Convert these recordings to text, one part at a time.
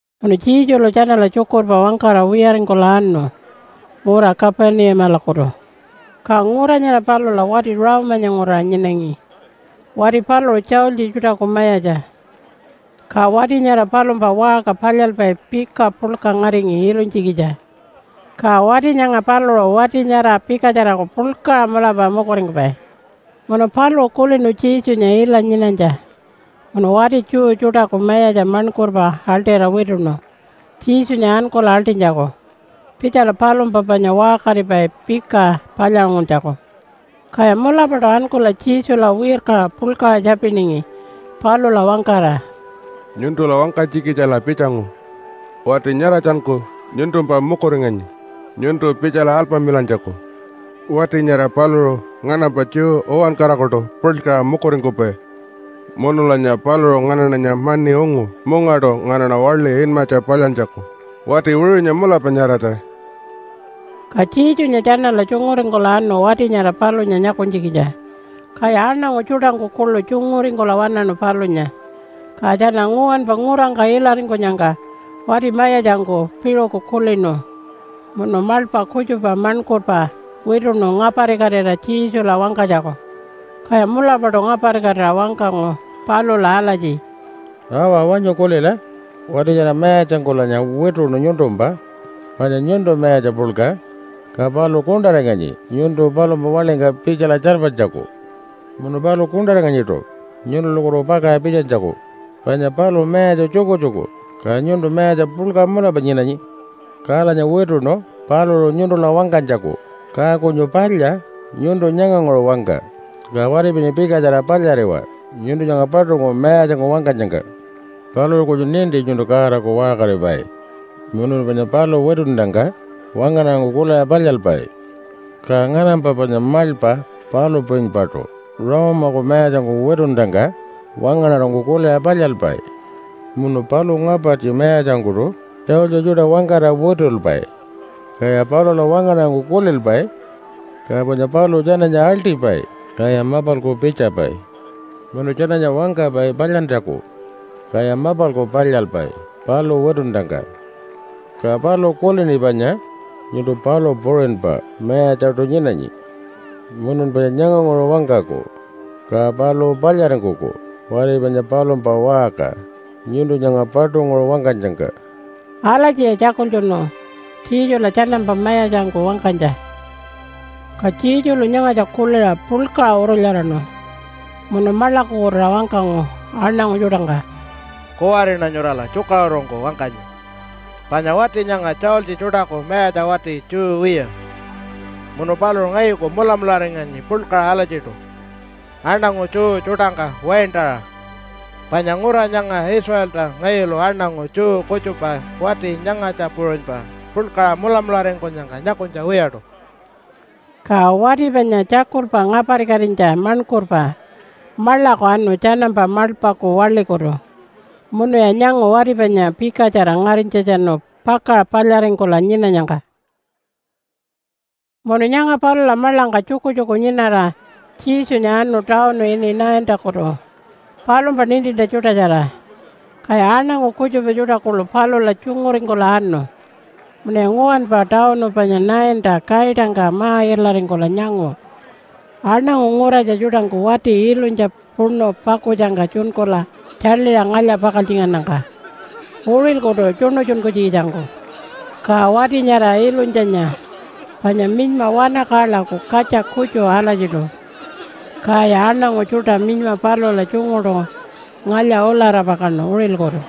Munu Jesulu tjanala tjukurpa wangkara wiyaringkula anu ngura Kapunimalakutu. Ka ngura nyara palula wati Rome-anya nguraṟa nyinangi. Wati paluṟu tjaultji tjuṯaku mayatja. Ka wati nyara palumpa waṟka palyalpai pika puḻka ngaringi ilunytjikitja. Ka wati nyanga paluṟu wati nyara pikatjaraku puḻkaṟa mulapa mukuringkupai. Munu paluṟu kulinu Jesunya ila nyinanytja munu wati Jew tjuṯaku mayatja maṉkurpa aḻṯira wituṉu Jesunya ankula aḻṯinytjaku pitjala palumpa panya waṟkaripai pika palyaṟunguntjaku. Kaya mulapaṯu ankula Jesula wirkaṟa puḻkaṟa tjapiningi palula wangkara, “Nyuntula wangkanytjikitjala pitjangu. Wati nyaratjanku nyuntumpa mukuringanyi nyuntu pitjala alpamilantjaku. Wati nyara paluṟu nganampa Jew uwankarakuṯu puḻkaṟa mukuringkupai munulanya paluṟu nganaṉanya mani ungu mungaṯu nganaṉa waḻi inmatja palyantjaku. Wati wiṟunya mulapa nyaratja.” Ka Jesunya tjanala tjunguringkula anu wati nyara palunya nyakunytjikitja, kaya aṉangu tjuṯangku kuḻu tjunguringkula waṉaṉu palunya. Ka tjana nguwanpa ngurangka ilaringkunyangka wati mayatjangku piṟuku kulinu munu maḻpa kutjupa maṉkurpa wituṉu ngaparikatira Jesula wangkanytjaku. Kaya mulapaṯu ngaparikatira wangkangu palula alatji, “Awa, wanyu kulila! Wati nyara mayatjangkulanya wituṉu nyuntumpa, panya nyuntu mayatja puḻka, ka paluṟu kuṉṯaringanyi nyuntu palumpa waḻingka pitjala tjarpanytjaku. Munu paluṟu kuṉṯaringanyiṯu nyuntulakutu pakaṟa pitjanytjaku, panya paluṟu mayatja tjukutjuku, ka nyuntu mayatja puḻka mulapa nyinanyi. Kalanya wituṉu paluṟu nyuntula wangkanytjaku, ka kunyu palya nyuntu nyanganguṟu wangka, ka wati panya pikatjara palyariwa nyuntu nyanga paṯunguṟu mayatjangku wangkanyangka. Paluṟu kunyu ninti nyuntu Godaku waṟkaripai munu panyan paluṟu witunnyangka wangaṉarangku kuliṟa palyalpai. Ka nganampa panya maḻpa palu puṟunypaṯu Rome-aku mayatjangku witunnyangka wangaṉarangku kuliṟa palyalpai. Munu paluṟu ngapartji mayatjangkuṯu tjaultji tjuṯa wangkara witulpai, kaya palula wangaṉarangku kulilpai. Ka panya paluṟu tjananya aḻṯipai, kaya mapalku pitjapai. Munu tjananya wangkapai palyantjaku, kaya mapalku palyalpai paluṟu witunnyangka. Ka paluṟu kulini panya nyuntu palu puṟunypa mayatjaṯu nyinanyi munun panya nyanganguṟu wangkaku, ka paluṟu palyaringkuku wati panya palumpa waṟka nyuntu nyanga paṯunguṟu wangkanyangka.” Alatjiya tjakultjunu Jesula tjanampa mayatjangku wangkanytja. Ka Jesulu nyangatja kuliṟa puḻkaṟa urulyaraṉu munu maḻakukutuṟa wangkangu aṉangu tjuṯangka, “Kuwariṉa nyurala tjukaṟurungku wangkanyi, panya wati nyanga tjaultji tjuṯaku mayatja wati Jew wiya, munu paluṟu ngayuku mulamularinganyi puḻkaṟa alatjiṯu aṉangu Jew tjuṯangka waintaṟa. Panya ngura nyanga Israelta ngayulu aṉangu Jew kutjupa wati nyangatja puṟunypa puḻkaṟa mulamularingkunyangka nyakunytja wiyaṯu.” Ka wati panya tjakulpa ngaparikatinytja maṉkurpa maḻaku anu tjanampa maḻpaku waḻikutu munuya nyangu wati panya pikatjara ngarinytjatjanu pakaṟa palyaringkula nyinanyangka. Munu nyanga palula maḻangka tjukutjuku nyinara, Jesunya anu tawunu ini Naintakutu palumpa nintintja tjuṯatjara. Kaya aṉangu kutjupa tjuṯa kuḻu palula tjunguringkula anu. Munuya nguwanpa tawunu panya Nainta kaitangka ma-ilaringkula nyangu, aṉangu nguratja tjuṯangku wati ilunytja puṉu pakutjangka tjunkula tjaḻiṟa ngalya-pakaltjingannyangka, uṟilkutu tjuṉutjunkunytjikitjangku. Ka wati nyara ilunytjanya panya minyma wanakaḻaku katja kutju alatjiṯu. Kaya aṉangu tjuṯa minyma palula tjunguṯu ngalya-ulara pakaṉu uṟilkutu.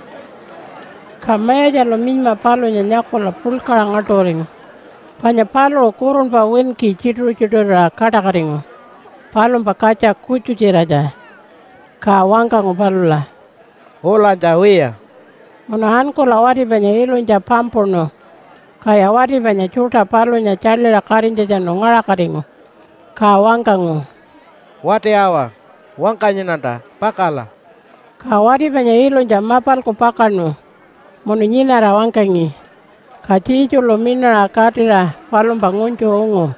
Ka Mayatjalu minyma palunya nyakula puḻkaṟa ngaḻṯuringu panya paluṟu kurunpa winki tjituṟu-tjituṟurira kaṯakatingu palumpa katja kutju-tjiratja. Ka wangkangu palula, “Ulanytja wiya.” Munu ankula wati panya ilunytja pampuṉu. Kaya wati panya tjuṯa palunya tjaḻiṟa katinytjatjanu ngaṟakatingu. Ka wangkangu, “Wati awa! Wangkanyiṉanta, pakala!” Ka wati panya ilunytja mapalku pakaṉu munu nyinara wangkangi. Ka Jesulu miṉaṟa katira palumpa ngunytju ungu.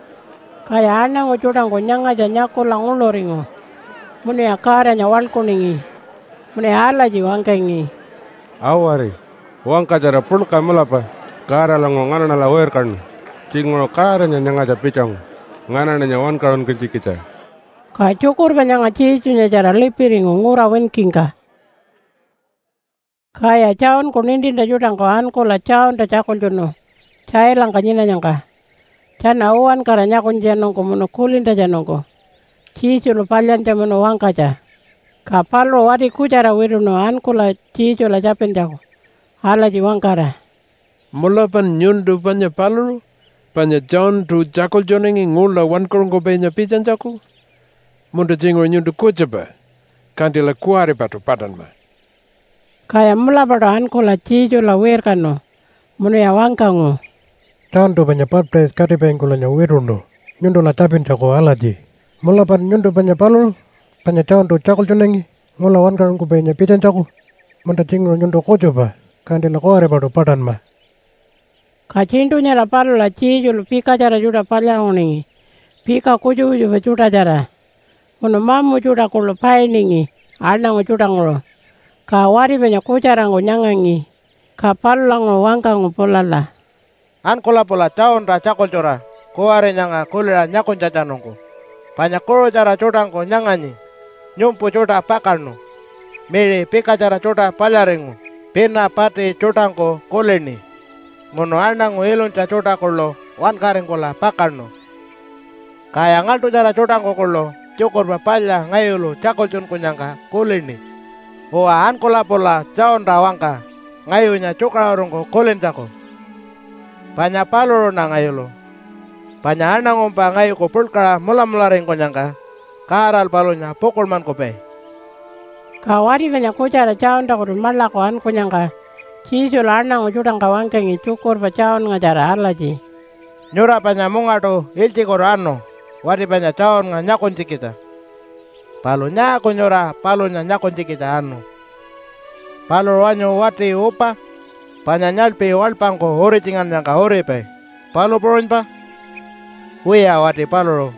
Kaya aṉangu tjuṯangku nyangatja nyakula nguḻuringu munuya Godanya waḻkuningi. Munuya alatji wangkangi, “Awari! Wangkatjara puḻka mulapa Godalanguṟu nganaṉala wirkanu. Tjinguṟu Godanya nyangatja pitjangu nganaṉanya wankaṟunkunytjikitja.” Ka tjukurpa nyanga Jesunyatjara lipiringu ngura winkingka. Kaya Johnku nintintja tjuṯangku ankula Johnta tjakultjunu tjailangka nyinanyangka tjana uwankara nyakunytjatjanungku munu kulintjatjanungku Jesulu palyantja munu wangkanytja. Ka paluṟu wati kutjara wituṉu ankula Jesula tjapintjaku alatji wangkara, “Mulapan nyuntu panya paluṟu, panya Johntu tjakultjunangi ngula wankaṟunkupainya pitjanytjaku? Munta tjinguṟu nyuntu kutjupa, kantila kuwaripaṯu paṯanma.” Kaya mulapaṯu ankula Jesula wirkanu munuya wangkangu, “Johntu panya baptise-katipaingkulanya wituṉu nyuntula tjapintjaku alatji, ‘Mulapan nyuntu panya paluṟu, panya Johntu tjakultjunangi ngula wankaṟunkupainya pitjanytjaku? Munta tjinguṟu nyuntu kutjupa, kantila kuwaripaṯu paṯanma.’” Ka tjiṉṯu nyara palula Jesulu pikatjara tjuṯa palyaṟunguningi pika kutjupa kutjupa tjuṯatjara munu mamu tjuṯa kuḻu painingi aṉangu tjuṯanguṟu, ka wati panya kutjarangku nyangangi. Ka palulanguṟu wangkangu pulala, “Ankula pula Johnta tjakultjura kuwari nyanga kuliṟa nyakunytjatjanungku, panya kuṟutjara tjuṯangku nyanganyi, nyumpu tjuṯa pakaṉu, miṟi pikatjara tjuṯa palyaringu, pina pati tjuṯangku kulini, munu aṉangu ilunytja tjuṯa kuḻu wankaringkula pakaṉu. Kaya ngaḻṯutjara tjuṯangku kuḻu Tjukurpa Palya ngayulu tjakultjunkunyangka kulini. Uwa, ankula pula Johnta wangka ngayunya tjukaṟurungku kulintjaku, panya paluṟuṉa ngayulu. Panya aṉangumpa ngayuku puḻkaṟa mulamularingkunyangka Godalu palunya pukuḻmankupai.” Ka wati panya kutjara Johntakutu maḻaku ankunyangka Jesulu aṉangu tjuṯangka wangkangi tjukurpa Johnngatjara alatji, “Nyura panya mungaṯu ilytjikutu anu wati panya Johnnga nyakunytjikitja. Palu nyaaku nyura palunya nyakunytjikitja anu? Paluṟu wanyu wati upa, panya nyaḻpi waḻpangku uritjingannyangka uripai, palu puṟunypa? Wiya, wati paluṟu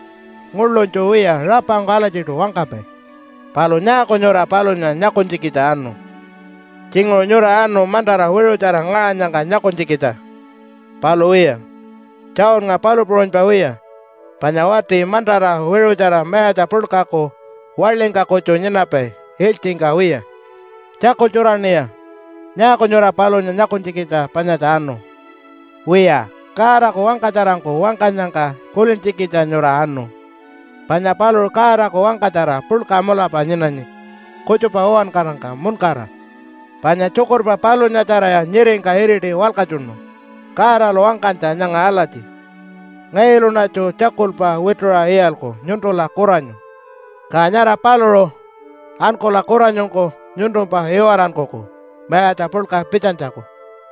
nguḻunytju wiya rapangku alatjiṯu wangkapai. Palu nyaaku nyura palunya nyakunytjikitja anu? Tjinguṟu nyura anu mantara wiṟutjara ngaṟanyangka nyakunytjikitja. Palu wiya, Johnnga palu puṟunypa wiya, panya wati mantara wiṟutjara mayatja puḻkaku waḻingka kutju nyinapai ilytjingka wiya. Tjakultjuraṉiya! Nyaaku nyura palunya nyakunytjikitja panyatja anu? Wiya, Godaku wangkatjarangku wangkanyangka kulintjikitja nyura anu, panya paluṟu Godaku wangkatjara puḻka mulapa nyinanyi kutjupa uwankarangka muṉkara. Panya tjukurpa palunyatjaraya nyiringka iriti walkatjunu Godalu wangkanytja nyanga alatji, ‘Ngayuluṉatju tjakulpa wituṟa iyalku nyuntula kuranyu. Ka nyara paluṟu ankula kuranyungku nyuntumpa iwarankuku mayatja puḻka pitjanytjaku.’”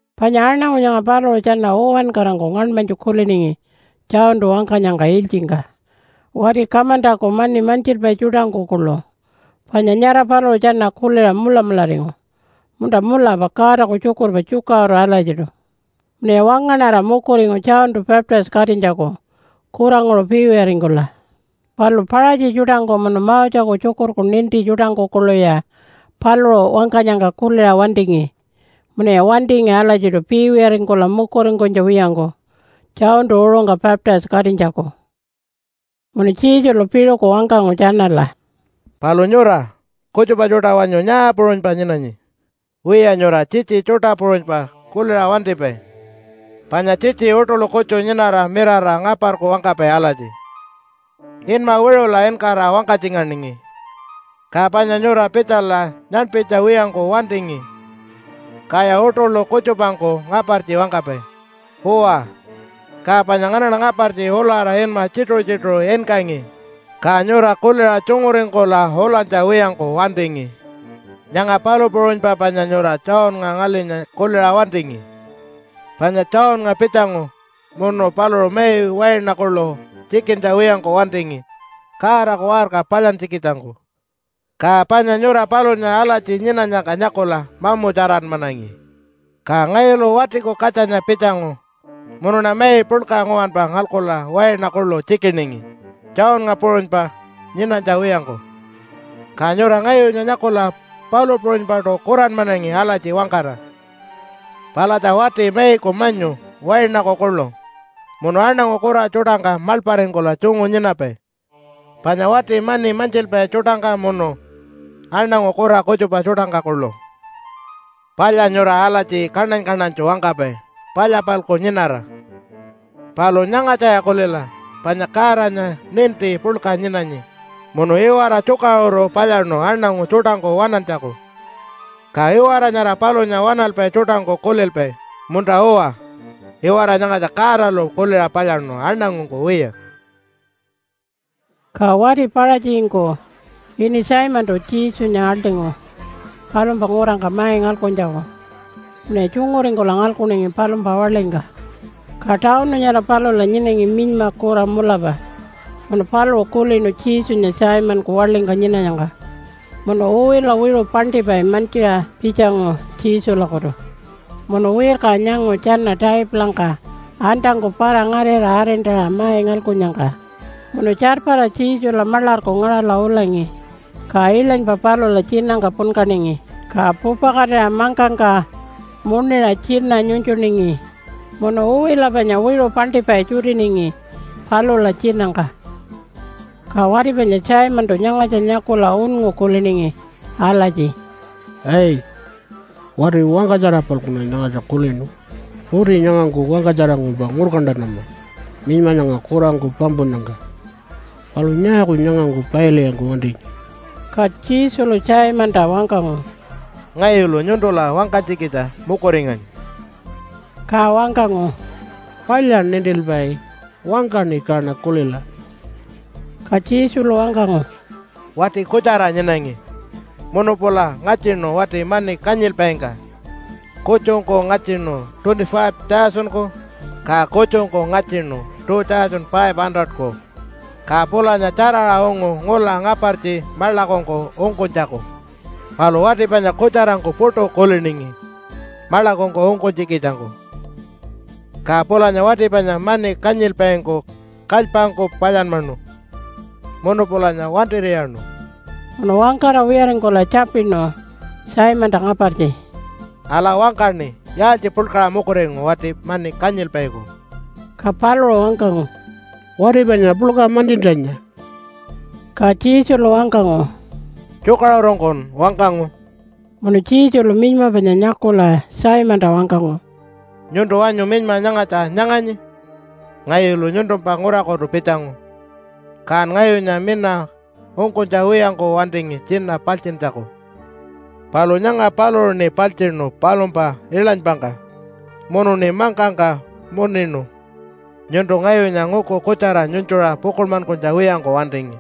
Panya aṉangu nyanga paluṟu tjana uwankarangku ngaṉmanytju kuliningi Johntu wangkanyangka ilytjingka, wati kamantaku mani mantjilpai tjuṯangku kuḻu panya nyara paluṟu tjana kuliṟa mulamularingu, “Munta mulapa Godaku tjukurpa tjukaṟuru alatjiṯu.” Munuya wangaṉara mukuringu Johntu baptise-katinytjaku kuranguṟu piiwiyaringkula. Palu Paṟatji tjuṯangku munu Moseku tjukurku ninti tjuṯangku kuḻuya paluṟu wangkanyangka kuliṟa wantingi, munuya wantingi alatjiṯu piiwiyaringkula mukuringkunytja wiyangku Johntu uṟungka baptise-katinytjaku. Munu Jesulu piṟuku wangkangu tjanala, “Palu nyura kutjupa tjuṯa wanyu nyaa puṟunypa nyinanyi? Wiya, nyura tjitji tjuṯa puṟunypa kuliṟa wantipai, panya tjitji uṯuḻu kutju nyinara mirara ngaparku wangkapai alatji, ‘Inma wiṟula inkara wangkatjinganingi, ka panya nyura pitjala nyaṉpinytja wiyangku wantingi.’ Kaya uṯuḻu kutjupangku ngapartji wangkapai, ‘Uwa, ka panya nganaṉa ngapartji ulara inma tjituṟu-tjituṟu inkangi, ka nyura kuliṟa tjunguringkula ulanytja wiyangku wantingi.’ Nyanga palu puṟunypa panya nyura Johnnga ngalinya kuliṟa wantingi. Panya Johnnga pitjangu munu paluṟu mai waina kuḻu tjikintja wiyangku wantingi Godaku waṟka palyantjikitjangku. Ka panya nyura palunya alatji nyinanyangka nyakula mamutjaranmanangi. Ka ngayulu Watiku Katjanya pitjangu munuṉa mai puḻka nguwanpa ngalkula waina kuḻu tjikiningi Johnnga puṟunypa nyinanytja wiyangku, ka nyura ngayunya nyakula palu puṟunypaṯu kuranmanangi alatji wangkara, ‘Palatja wati maiku manyu, wainaku kuḻu, munu aṉangu kura tjuṯangka maḻparingkula tjungu nyinapai, panya wati mani mantjilpai tjuṯangka munu aṉangu kura kutjupa tjuṯangka kuḻu.’ “Palya nyura alatji kaṉany-kaṉanytju wangkapai palya-palku nyinara. Palu nyangatjaya kulila, panya Godanya ninti puḻka nyinanyi munu iwara tjukaṟuru palyaṉu aṉangu tjuṯangku waṉantjaku, ka iwara nyara palunya waṉalpai tjuṯangku kulilpai, ‘Munta-uwa, iwara nyangatja Godalu kuliṟa palyaṉu, aṉangungku wiya.’” Ka wati Paṟatjingku ini Simontu Jesunya aḻṯingu palumpa ngurangka mai ngalkuntjaku munuya tjunguringkula ngalkuningi palumpa waḻingka. Ka tawunu nyara palula nyinangi minyma kura mulapa munu paluṟu kulinu Jesunya Simonku waḻingka nyinanyangka munu uwila wiṟu paṉṯipai mantjiṟa pitjangu Jesulakutu. Munu wirkaṟa nyangu tjana taipulangka antangku para-ngarira arintaṟa mai ngalkunnyangka, munu tjarpara Jesula maḻarku ngaṟala ulangi. Ka iḻanypa palula tjinangka punkaningi, ka pupakatira mangkangka muṉiṟa tjina nyunytjuningi munu uwila panya wiṟu paṉṯipai tjutiningi palula tjinangka. Ka wati panya Simontu nyangatja nyakula unngu kuliningi alatji, “Ai! Wati wangkatjara-palkuṉa nyangatja kulinu. Uti nyangangku wangkatjarangkumpa ngurkantanama minyma nyanga kurangku pampunnyangka. Palu nyaaku nyangangku pailwiyangku wantinyi.” Ka Jesulu Simonta wangkangu, “Ngayulu nyuntula wangkanytjikitja mukuringanyi.” Ka wangkangu, “Palya nintilpai, wangkaṉi kaṉa kulila.” Ka Jesulu wangkangu, “Wati kutjara nyinangi munu pula ngatjinu wati mani kanyilpaingka. Kutjungku ngatjinu $25,000-ku, ka kutjungku ngatjinu $2,500-ku, ka pulanya tjaraṟa ungu ngula ngapartji maḻakungku ungkunytjaku. Palu wati panya kutjarangku puṯu kuliningi maḻakungku ungkunytjikitjangku. Ka pulanya wati panya mani kanyilpaingku kalypangku palyanmanu munu pulanya wantir'iyaṉu.” Munu wangkara wiyaringkula tjapinu Simonta ngapartji, “Ala, wangkaṉi! Yaaltji puḻkaṟa mukuringu wati mani kanyilpaiku?” Ka paluṟu wangkangu, “Wati panya puḻka mantjintjanya.” Ka Jesulu wangkangu, “Tjukaṟurungkun wangkangu.” Munu Jesulu minyma panya nyakula Simonta wangkangu, “Nyuntu wanyu minyma nyangatja nyanganyi? Ngayulu nyuntumpa ngurakutu pitjangu, kan ngayunya mina ungkunytja wiyangku wantingi tjina paltjintjaku, palu nyanga paluṟuṉi paltjiṉu palumpa iḻanypangka munuṉi mangkangka muṉinu. Nyuntu ngayunya nguku kutjara nyunytjuṟa pukuḻmankunytja wiyangku wantingi,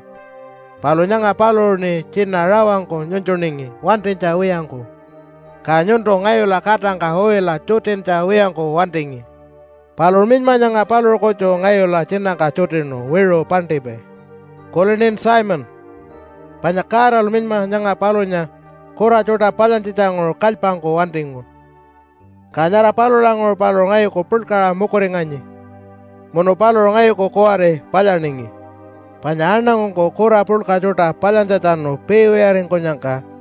palu nyanga paluṟuṉi tjina rawangku nyunytjuningi wantinytja wiyangku. Ka nyuntu ngayula katangka uwila tjutintja wiyangku wantingi, palu minyma nyanga paluṟu kutju ngayula tjinangka tjutinu wiṟu paṉṯipai. Kulinin Simon? Panya Godalu minyma nyanga palunya kura tjuṯa palyantjitjanguṟu kalypangku wantingu, ka nyara palulanguṟu paluṟu ngayuku puḻkaṟa mukuringanyi munu paluṟu ngayuku kuwari palyaningi. Panya aṉangungku kura puḻka tjuṯa palyantjatjanu piiwiyaringkunyangka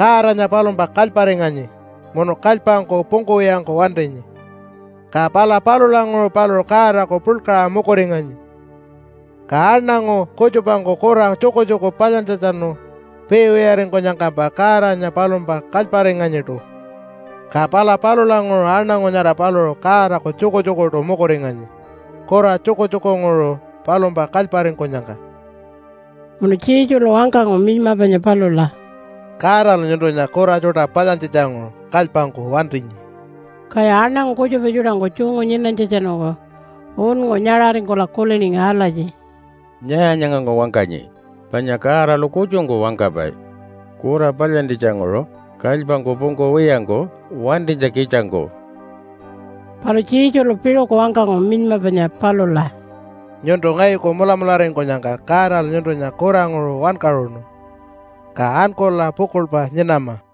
Godanya palumpa kalyparinganyi munu kalypangku pungkuwiyangku wantinyi, ka pala palulanguṟu paluṟu Godaku puḻkaṟa mukuringanyi. Ka aṉangu kutjupangku kura tjukutjuku palyantjatjanu piiwiyaringkunyangkampa Godanya palumpa kalyparinganyiṯu, ka pala palulanguṟu aṉangu nyara paluṟu Godaku tjukutjukuṯu mukuringanyi kura tjukutjukunguṟu palumpa kalyparingkunyangka.” Munu Jesulu wangkangu minyma panya palula, “Godalu nyuntunya kura tjuṯa palyantjitjanguṟu kalypangku wantinyi.” Kaya aṉangu kutjupa tjuṯangku tjungu nyinanytjatjanungku unngu nyaṟaringkula kuliningi alatji, “Nyaa nyangangku wangkanyi? Panya Godalu kutjungku wangkapai kura palyantjitjanguṟu kalypangku pungkuwiyangku wantinytjikitjangku?” Palu Jesulu piṟuku wangkangu minyma panya palula, “Nyuntu ngayuku mulamularingkunyangka Godalu nyuntunya kuranguṟu wankaṟunu. Ka ankula pukuḻpa nyinama!”